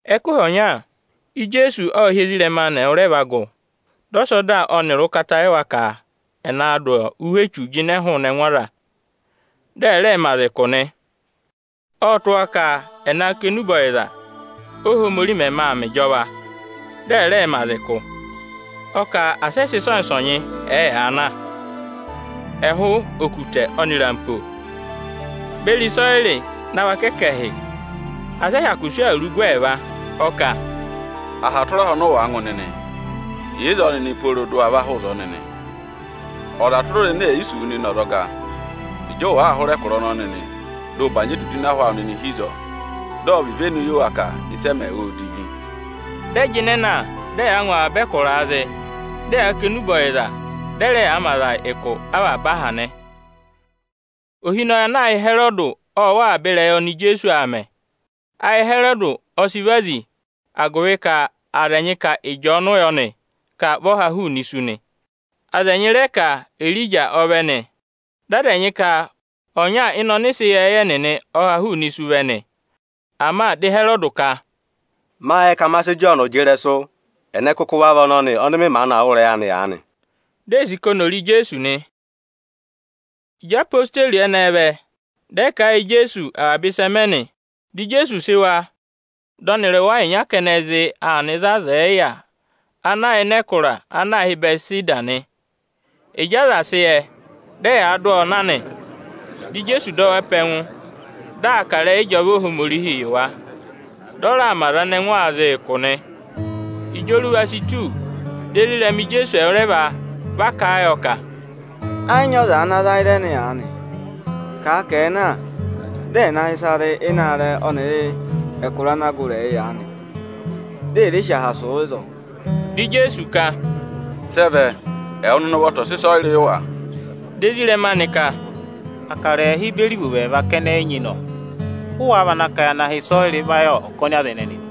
Ẹkụhị ọnya, Ijeesu ộ hị́ ezirẹma anị ẹwụrẹva gụ, dị ọ sị ọda ọnịrị ụkata yị wa ka ẹ̀ naa dụ avaba ụhwẹ echu nịnị ị jịnẹ hụụnị ẹngụ aza, dị ẹ̀ rẹẹ mẹ aza ụkụ nị. Ộ tụ́ wa ka ẹ̀ naa kà enube ọyịza, Óhomorihi mẹmẹ aa mẹ ịjọva, dị ẹ̀ rẹẹ mẹ aza ụkụ. Ọ kà asị ẹ sị ịsọnyị-ịsọnyị ẹ̀ẹ yaa na, ẹhụụ okutẹ ọnịrị ampo beri ịsọyịrị na vaka ẹkẹhị, asị ẹ hyakụ sị awuru gụ ẹẹva. Ọ kà, “Irehi tụra irehi ọnị ụ wàa ngụ nịnị, yà ịzọọ nịnị pooro dị ụ wa va hụrẹ ẹkụra ọnọọ nịnị! Aha tụra aha ọnị ọza è yi sì wu nịnị ọzọga, ịjị ụ wàa hụrẹ ẹkụra ọnọnị nịnị, bànyị edudu ịnị ahụ awụ nịnị hi ịzọọ, dị ọ̀ vị ivenu yị wa ka ịsị ẹ mẹ, ô divi!” Dị ẹ jịnẹ na, dị ẹyaa ngụ avaba ẹkụraa zị, dị ẹ yaa kà enube ọyịza, dị ẹ rẹ yaa mẹ aza ụkụ avaba aha nị. Ohinọyị ana aā hị́ Ịhẹrọdị ộ wụ́ avaba ịrẹyị oni Ijeesu aa mẹ. Ayị Ịhẹrọdị ọ sị vazi, agụvị ka aza ẹnyị ka Ịjọọnụ yọ nị, ka vị ọ ha hụụnị isu nị. Aza ẹnyị rẹ ka Erija ọ vẹ nị; dị aza ẹnyị ka ọnya ịnị ọnịsẹ ịyẹẹyẹ nịnị ọ ha hụụnị isu vẹ nị. Ama dị Ịhẹrọdị ka, “Mâ yẹ ka ma sị Ịjọọnụ jị ịrẹsụ, ẹnẹ kụkụ va vị ọnọnị, ọnị mị maanị aa wụ́ ịrẹyị anị aanị?” Di ee sì ka oni ò re Ijeesu nị. Ịjị odeyi ẹnẹẹ vẹ, dị ẹ kà a yị Ijeesu avaba ịsị ẹ mẹ nị. Dị Ijeesu sị wa, dị ọnịrị wa ịnya kẹnẹ zị aa nọ ịzị aza ẹ̀ yị yà ana yà ịnị ẹkụra ana aā hị́ Ịbẹtịseda nị. Ịjị aza sị yẹ, dị ẹ yaa dụ ọọ na nị. Dị Ijeesu dọ wa pe ẹngụ, di aa kà ịrẹyị ịjọva Ohomorihii yị wa, dị ọ raa mẹ aza ẹnẹ ẹngụ aa zị ụkụ nị. Ịjị oruva si tù, di ezirẹma Ijeesu ẹwụrẹva va kà a yọ ka, “Ẹ yị nyị aza ana ra ịzẹnị aanị. Kàa ka ẹ̀ẹ na, dị ẹ̀ na hị́ ịsa rị ịnị aarẹ ọnịrị ịnị ẹkụra ana gụrị ẹyị aanị, di è re sì aha sụ̀ ịzọọ!” Dị Ijeesu ka, “Sị ẹ vẹ, ẹwụ nịnị ụvọta ọ̀ sị ịsọyịrị yị wa!” Di ezirẹma anị ka, “Akara ẹẹhị beri ivovo ẹẹva kẹnẹ, ị nyị nọ! Ụ wáá vana ka ya na hị́ ịsọyịrị va yị ọkọnị aza ẹnẹnị nị?”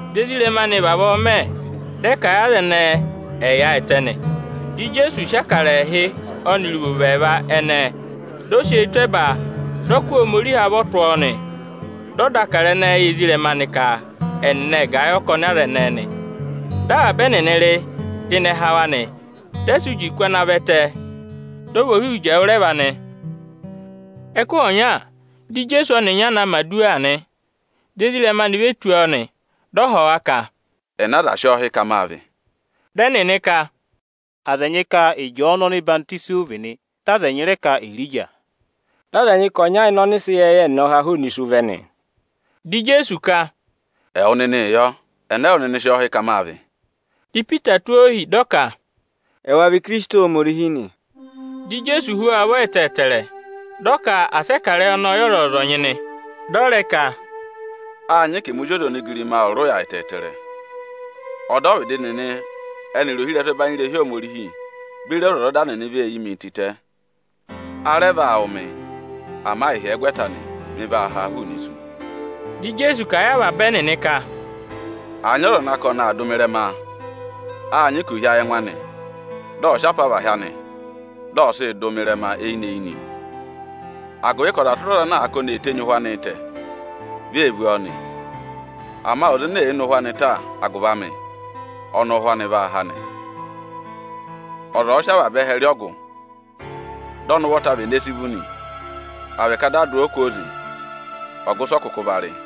Di ezirẹma anị vavọọ mẹ, dị ẹ ka aza ẹnẹẹ ẹ̀ yaayịtẹ nị. Ijeesu ộ sị akara ẹẹhị ọnịrị ivovo ẹẹva ẹnẹẹ, dị ọ sị eyi tụ́ ẹba, dị ọ kụ́ Ohomorihi avọ tụ́ ọọ nị. Dị ọ dà akara ẹnẹẹ yị ezirẹma anị ka ẹnịnị ẹ̀ gà ẹ yị ọkọnị aza ẹnẹẹ nị. Avaba ẹnịnị ệ rị, dị ịnẹ há wa nị. Dị ẹ sị uji kụ́ ana vẹtẹ, dị ọ vị ohihi uji ẹwụrẹva nị. Ẹnị Ijeesu vị? Ẹkụhị ọnya, di Ijeesu ọnịnya na aa mẹ̀ aduwa nị; ezirẹma anị ê ve tù ọ, dị ọ họ̀ wa ka, “Ẹnị aza sị ọ hị́ ka máa vị?” Dị ẹnịnị ka, “Aza ẹnyị ka Ịjọọnụ ọhwọzenyi ụ vị nị; dị aza ẹnyị rẹ ka Erija; dị aza ẹnyị ka ọnya ịnị ọnịsẹ ịyẹẹyẹ nịnị ọ ha hụụnị isu vẹ nị.” Dị Ijeesu ka, “Ẹwụ nịnịị yọ, ẹnẹ ẹwụ nịnị sị ọọ hị́ ka máa vị?” Di Ipita tụ́ ohi, dị ọ ka, “Ẹwa vị Ikirisiti Ohomorihi nị.” Dị Ijeesu hú wa ụvọ ẹtẹẹtẹrẹ, dị ọ ka asị ẹ kà ịrẹyị ọnọọ yị ọzọnyị-ọzọnyị nị. Dị ọ rẹ ka, “Â nyị ka ẹmị Ozi ọza onigirima ọ̀ rị ụya ẹtẹẹtẹrẹ. Ọdọvịdị nịnị ẹnịrị ohirẹsụ ẹbanyị irehi Ohomorihi beri ọzwọzọda nịnị vee yi mii tịtẹ. A rẹ vaa wụ̀ mị; ama ịhyẹgwẹta anị, mị vaa ha hụụnị isu.” Dị Ijeesu kà a yị avaba ẹnịnị ka, “Àa nyị ọza ana ka ọnị aa dụ mị ịrẹma, â nyị ka ò hí ayị ẹngụ anị, dị ọ̀ sị apavahị anị, dị ọ̀ sịị dụ mị ịrẹma eyinị-eyinị. Agụvị ka ọza tụra ọza ana àa ka oni ee tenyi ụhwẹ anịị tẹ, vi ee vú ọọ nị; ama ọza ene èe ne ụhwẹ anị ta agụvị amị, ọnị ụ́hwẹ anị vaa há nị. Ọza ọ̀ọ sị avaba ẹhẹ rị ọgụ, dị ọnị ụvọta vene si vú nị, à vị ka dị à dụ ọọ kwooze nị, ọgụ ịsị ọ kụkụ va rị?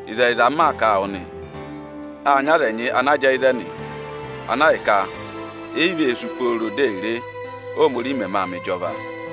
Ịzẹyịza, m maa kà a wụ nịnị nị, â nyị aza ẹnyị ana jẹẹ ịzẹnị, ana ahịka e yi vee sú pooro di è re, Óhomorihi mẹmẹ vaa mẹ ịjọva.”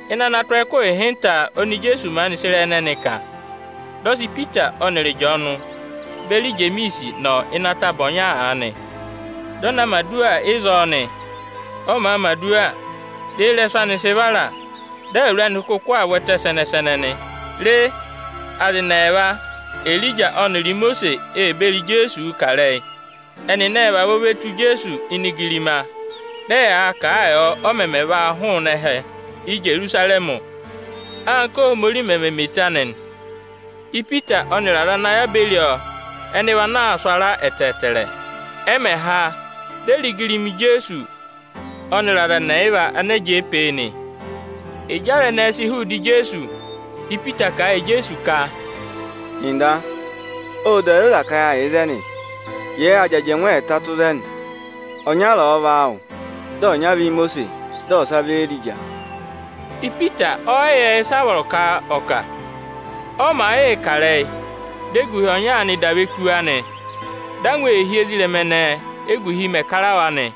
Ịnị ana tụ́ ọọ ẹkụhị ịhịnta oni Ijeesu maanị sị ịrẹyị ẹnẹnị kà, dị ọ sị Ipita ọnịrị Ịjọọnụ beri Ijemiisi nọ ịnị ataba ọnya aanị, dị ọ na mẹ̀ aduwa ịzọọ nị. Ọ màa mẹ̀ aduwa, di eyirẹsụ anị sị vara, dị awuru anị kụkụ aa vwẹtẹ sẹnẹ-sẹnẹ nị. Re, aza ẹnị ẹẹva, Erija ọnịrị Imosiisi, ee beri Ijeesuu kà ịrẹyị. Ẹnịnị ệ vavọọ ve tù Ijeesu ini igirima, dị ẹyaa kà a yọ, ọ mẹmẹ vaa hụụnị ẹhẹ Íjerusarẹmị, anka Óhomorihi mẹ̀ mẹ eto anị. Ipita ọnịrị aza ana yà beri ọọ ẹnị vị ana aa sụ ara ẹtẹẹtẹrẹ. Ẹ mẹ̀ ha, di e re igirima Ijeesu ọnịrị aza ẹnị ẹyịva ana jẹẹ pee nị. Ịjị aza ẹnẹẹ sị hụụ ịdị Ijeesu, dị Ipita kà a yị Ijeesu ka, “Nda, ộ da zoza ka yâ yà ịzẹnị. Jẹẹ ya jị ajẹngụ ẹẹta tụ́ ịzẹnị: ọnyara ọ̀ọ vị áawụ, dị ọnyara vị Íimosiisi, dị ọsa vị Éerija.” Ipita ọ yị yẹ ịsị aa kà. Ọ màa yịị kà ịrẹyị, di eguhi ọnya aanị dà ve kú wa nị. Dị angwa ee hí ezirẹma ẹnẹẹ, éguhi mẹ̀ kara wa nị.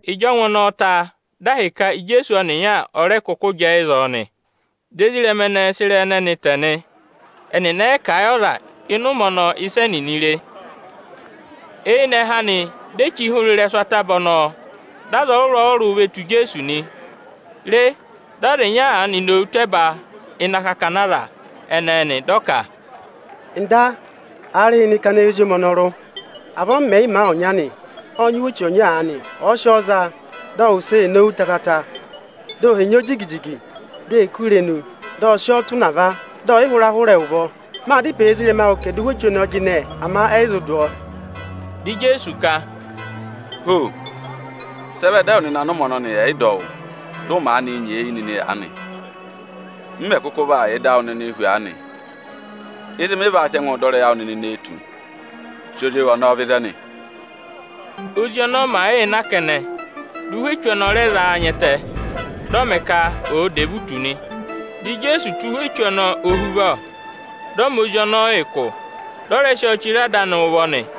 Ịjị ọngwẹ ọnọọ sị ịrẹyị anị kà ta, dị ahịka Ijeesu ọnịnya ọ rẹ kụkụ jẹẹ ịzọọ nị. Dị ezirẹma ẹnẹẹ sị ịrẹyị ẹnẹnị tẹ nị; ẹnịnị ẹ yị kà a yị ọza ịnị ụmẹ ọnọọ ịsị ẹnịnị re. Eyinẹhẹ anị, di e chí hụrẹ ịrẹsụ ataba ọnọọ, dị aza ọrụrụ-ọrụrụ ve tù Ijeesu nị. Re, dị ọza ịnya aanị nowu tụ́ ẹba ịnị akakana aza ẹnẹẹ nị, dị ọ ka, “Nda, aarịhịnị kana eyi ozi ọnọrụ amị ọnọnị mị de; aanị m mẹ̀ yị ma a ọnya nọ. Ộ nyị ụhwẹ echu ọnya aanị; ọ̀ọ sị ọọ za, dị ọ wụsẹ ee nowu tatata, di o henyi ọọ jigi-jigi, di ee kú irenu, dị ọ sị ọọ tụ̀ ụnava, dị ọ yị hụra hụrẹ ẹ ụvọ. Mâ dá ịpẹ yị ezirẹma awụ ka ẹ̀ dụ ụhwẹ echu ọnọọ jịnẹ; ama ẹnịnị ẹ yị zụ dụ ọọ.” Dị Ijeesu ka, “Ho! Sị ẹ vẹ dị ẹwụ nịnị anị ụmẹ ọnọnị ẹ̀ yị dọ wụ́, dị ụ maanị nyeeyi nịnị aanị? M mẹ̀ kụkụ vaa yà ịda awụ nịnị hu aanị? Ịzị mị vaa sị ẹngụ dọ ịrẹyị awụ nịnị nee tù? Sị ozi ewu ọnọọ vẹ ịzẹnị!” Ózi ọnọọ màa yịị na kẹnẹ, dị ụhwẹ echu ọnọọ rẹ za a nya ẹtẹ, dị ọ mẹ ka ọ̀ọ dà evutu nị. Ijeesu ộ tụ́ ụhwẹ echu ọnọọ ohuvọ, dị ọ mẹ ozi ọnọọ ụkụ, dị ọ rẹ sị ọọ chire ada anị ụvọ nị.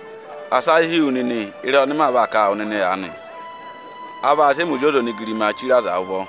“Asị ayị hí wu nịnị ịrẹyị ọnị maa vaa kà a wụ nịnị aanị: A vaa sị ẹmị Ozi ọza onigirimaa chire aza ụvọ.”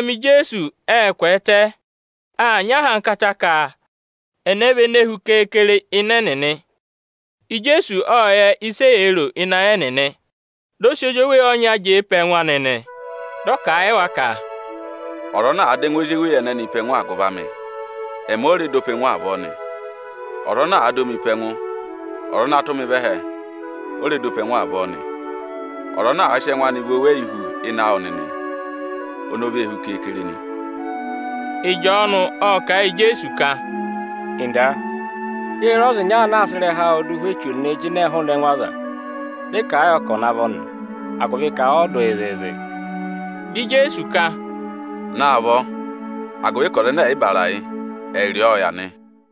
Ezirẹma Ijeesu ệ kwẹẹtẹ aa nyị ahankata ka ẹnẹ vị ene hu keekere ịnị ẹnịnị. Ijeesu ộ yẹ ịsị eyee ro ịnị ayị ẹnịnị, dị ọ sị ozweyi ọnya jẹẹ pe ẹngụ anị nị. Dị ọ kà a yị wa ka, “Ọza ana àa dọ ẹngụ ozweyi ọnọnị pe ẹngụ agụvị amị, ẹmị ọ rẹ dọ pe ẹngụ avọọ nị. Ọza ana àa dọ mị pe ẹngụ, ọza ana tụ́ mị vẹ ẹhẹ, ọ rẹ dọ pe ẹngụ avọọ nị. Ọza ana ka ẹngụ anị chi hu ịnị awụ nịnị, oni o hu keekere nị.” Ịjọọnụ ộ kà a yị Ijeesu ka, “Nda, yê re ọza ịnya ana aa sị ịrẹha awụụ dụ ụhwẹ echu nịnị ị jịnẹẹ hụụnị ẹngụ aza. Dị ị kà a yọ ka ọ̀ navọ nị, agụvị ka ọ yị dụ yị zịịzị.” Dị Ijeesu ka, “Naavọ, agụvị ka ọza ẹnẹ ẹ̀ yị bàrà yị, ẹ yị rị ọọ ọ yà nị.”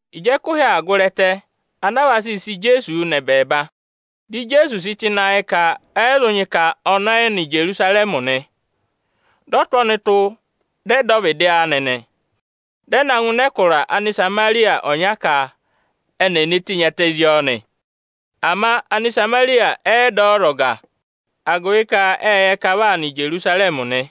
Ịjị ẹkụhị aa gụrị ẹtẹ ana aa vaa sịị sị Ijeesu nọ ẹbẹẹba, dị Ijeesu sị tụ́ ịnị ayị ka ẹ yị zụ nyị ka ọnị ọ yị nọ Ijerusarẹmị nị. Ộ tụ́ ọnụtụ, ka ẹ dọ ọvịdị anị. Dị ẹ na ngụ ịnị ẹkụra Anịsamarịya ọnya ka eni è ne tenyi ẹtẹ zí ọọ nị. Ama Anịsamarịya nịnị ẹ yị dọ ọ ọzọga, agụvị ka ệ yẹ ka vị aa nọ Ijerusarẹmị nị.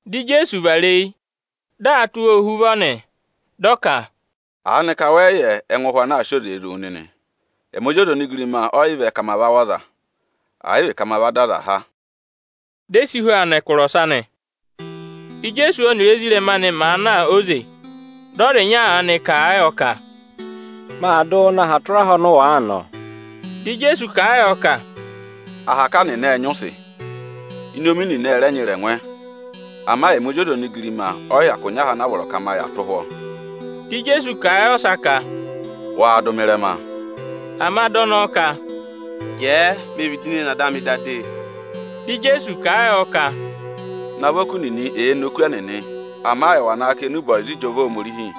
Dị Ijeesu vara eyi, di aa tụ́ wa ohuvọ nị. Dị ọ ka, “Aanịka wẹ yị yẹ ẹngụ ụhwẹ ana aa sị oze zụ̀ wụ nịnị? Ẹmị Ozi ọza onigirima ọ yị vẹ ka ma va wụ̀ ọza, ẹ̀ yị vị ka ma dọ aza há”. Di e si hu aa nọ ẹkụra ọsa nị. Íjeesu ọnịrị ezirẹma anị màa na óze, dị ọza ịnya aanị kà a yọ ka, “Maa dụ wụụ nọ aha tụra aha ọnị ụ wàa nọ.” Dị Ijeesu kà a yọ ka, “Ahaka nịnị ệ nyị ụsị, inomi nịnị ẹ rẹ nyị ịrẹngwẹ, ama ẹmị Ozi ọza onigirima ọ yị hyakụ nyị aha ana a vọrọ ka ma yà tụ́ ụhwọ́.” Dị Ijeesu kà a yị ọsa ka, “Waa dụ mị ịrẹma!” Ama dị ọnọọ ka, “Jẹẹ me vịdị ne ne ada amị da de!” Dị Ijeesu kà a yọ ka, “Navọ oku nịnị èe ne oku ẹnịnị; ama ẹwà naa kà enube ọyịza ịjọva Ohomorihi!”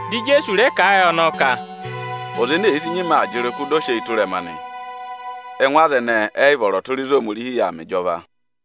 Dị Ijeesu rẹ kà a yị ọnọọ ka, “Ọza ene èe sì nyima aa jị ịrụkụ di o sị eyi tụ́ ịrẹma nị, ẹngụ aza ẹnẹẹ ẹ yị vọrọ tụra ịzị Ohomorihi yà aa mẹ ịjọva.”